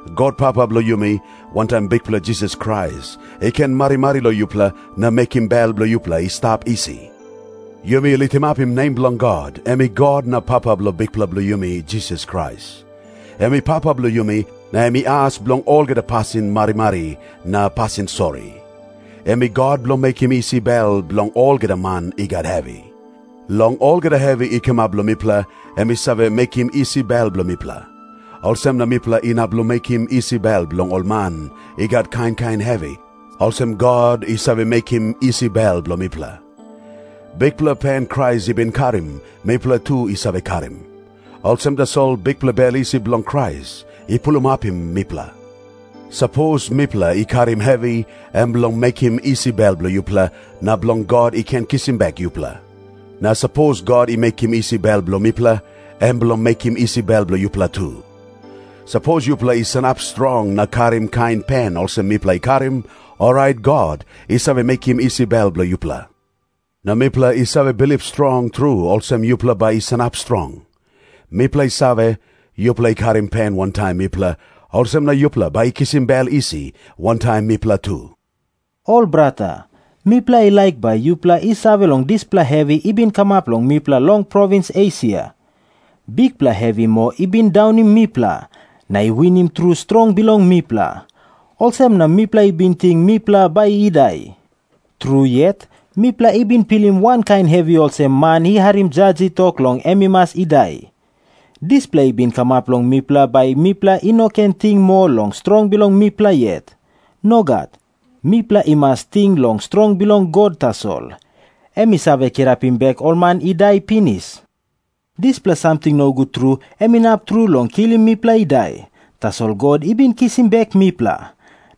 God Papa bilong yumi, wantaim Bikpela Jisas Krais, i ken marimari long yupela na mekim bel bilong yupela i stap isi. Yumi litimapim nem bilong God, em i God na Papa bilong Bikpela bilong yumi Jisas Krais. Em i Papa bilong yumi, na em i as bilong olgeta pasin marimari na pasin sori. Em i God bilong mekim isi bel bilong olgeta man i gat hevi. Long olgeta hevi i kamap long mipela, em i save mekim isi bel bilong mipela. Olsem na mipela inap long mekim isi bel bilong ol man i gat kain kain hevi, olsem God i save mekim isi bel bilong mipela. Bikpela pen Krais i bin karim, mipela tu i save karim. Olsem tasol bikpela bel isi bilong Krais i pulimapim mipela. Sapos mipela i karim hevi, em bilong mekim isi bel bilong yupela, na bilong God i ken kisim bek yupela. Na sapos God i mekim isi bel bilong mipela, em bilong mekim isi bel bilong yupela tu. Sapos yupela i sanap strong na karim kain pen olsem mipela i karim, orait God i save mekim isi bel bilong yupela. Na mipela i save bilip strong tru olsem yupela bai i sanap strong. Mipela i save, yupela i karim pen wantaim mipela, olsem na yupela bai i kisim bel isi wantaim mipela tu. Ol brata, mipela i laik bai yupela i save long dispela hevi i bin kamap long mipela long provins Esia. Bikpela hevi moa i bin daunim mipela, na i winim tru strong bilong mipela. Olsem na mipela i bin ting mipela bai i dai. Tru yet, mipela i bin pilim wankain hevi olsem man i harim jas i tok long em i mas i dai. Dispela i bin kamap long mipela bai mipela i no ken ting moa long strong bilong mipela yet. Nogat. Mipela i mas ting long strong bilong God tasol, em i save kirapim bek ol man i dai pinis. Dispela samting nogut tru em inap tru long kilim mipela i dai, tasol God i bin kisim bek mipela.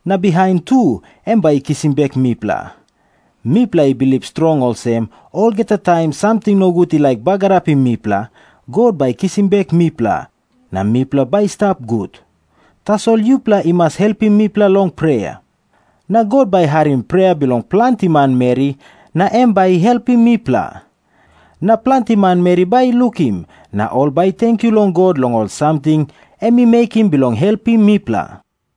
Na bihain tu em bai i kisim bek mipela. Mipela i bilip strong olsem, olgeta taim samting nogut i laik bagarapim mipela, God bai i kisim bek mipela, na mipela bai i stap gut. Tasol yupela i mas helpim mipela long prea. Na God bai i harim prea bilong planti manmeri na em bai i helpim mipela. Na planti manmeri bai i lukim, na ol bai i tenkyu long God long ol samting em i mekim bilong helpim mipela.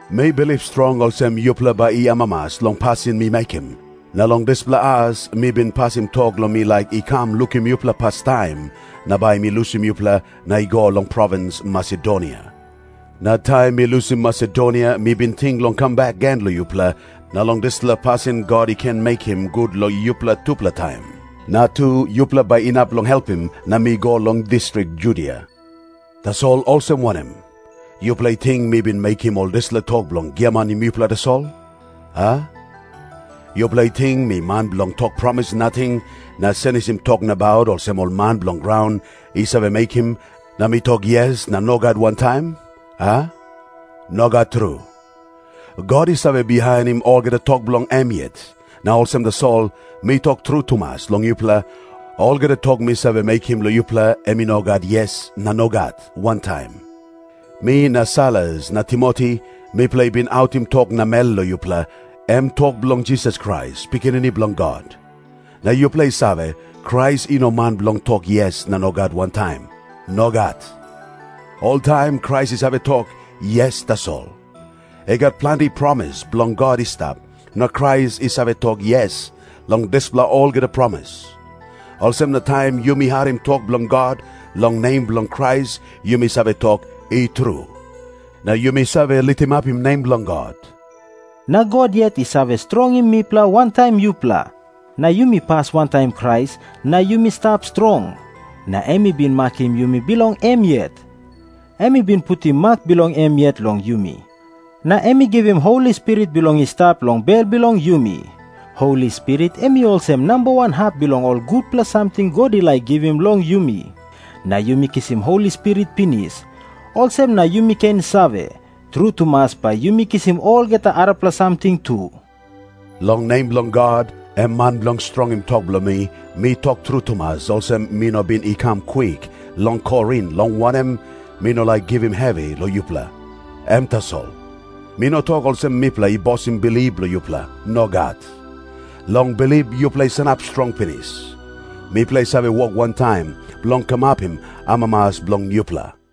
Mi bilip strong olsem yupela bai i amamas long pasin mi mekim, na long dispela as mi bin pasim tok long mi laik i kam lukim yupela pastaim, na bai mi lusim yupela na i go long provins Masedonia. Na taim mi lusim Masedonia mi bin ting long kam bek gen long yupela, na long dispela pasin God i ken mekim gut long yupela tupela taim. Na tu, yupela bai inap long helpim na mi go long distrik Judia. Tasol olsem wanem? Yupela i ting mi bin mekim ol dispela tok bilong giamanim yupela tasol, a? Yupela i ting mi man bilong tok promis nating na senisim tok nabaut olsem ol man bilong graun i save mekim, na mi tok "Yes" na "Nogat" wantaim, a? Nogat tru. God i save bihainim olgeta tok bilong em yet, na olsem tasol mi tok tru tumas long yupela, olgeta tok mi save mekim long yupela, em i no gat "Yes" na "Nogat" wantaim. Mi na Sailas na Timoti, mipela i bin autim tok namel long yupela, em tok bilong Jisas Krais, Pikinini Bilong God. Na yupela i save, Krais i no man bilong tok "Yes" na "Nogat" wantaim. Nogat. Oltaim Krais i save tok "Yes" tasol. I gat planti promis bilong God i stap, na Krais i save tok "Yes" long dispela olgeta promis. Olsem na taim yumi harim tok bilong God, long nem bilong Krais yumi save tok "I tru", na yumi save litimapim nem bilong God. Na God yet i save strongim mipela wantaim yupela, na yumi pas wantaim Krais na yumi stap strong. Na em i bin makim yumi bilong em yet. Em i bin putim mak bilong em yet long yumi, na em i givim Holi Spirit bilong i stap long bel bilong yumi. Holi Spirit em i olsem namba wan hap bilong ol gutpela samting God i laik givim long yumi. Na yumi kisim Holi Spirit pinis, olsem na yumi ken save, tru tumas bai yumi kisim olgeta arapela samting tu. Long nem bilong God, em man bilong strongim tok bilong mi, mi tok tru tumas olsem, mi no bin i kam kwik long Korin, long wanem, mi no laik givim hevi long yupela. Em tasol. Mi no tok olsem mipela i bosim bilip bilong yupela. Nogat. Long bilip yupela i sanap strong pinis. Mipela i save wok wantaim bilong kamapim amamas bilong yupela.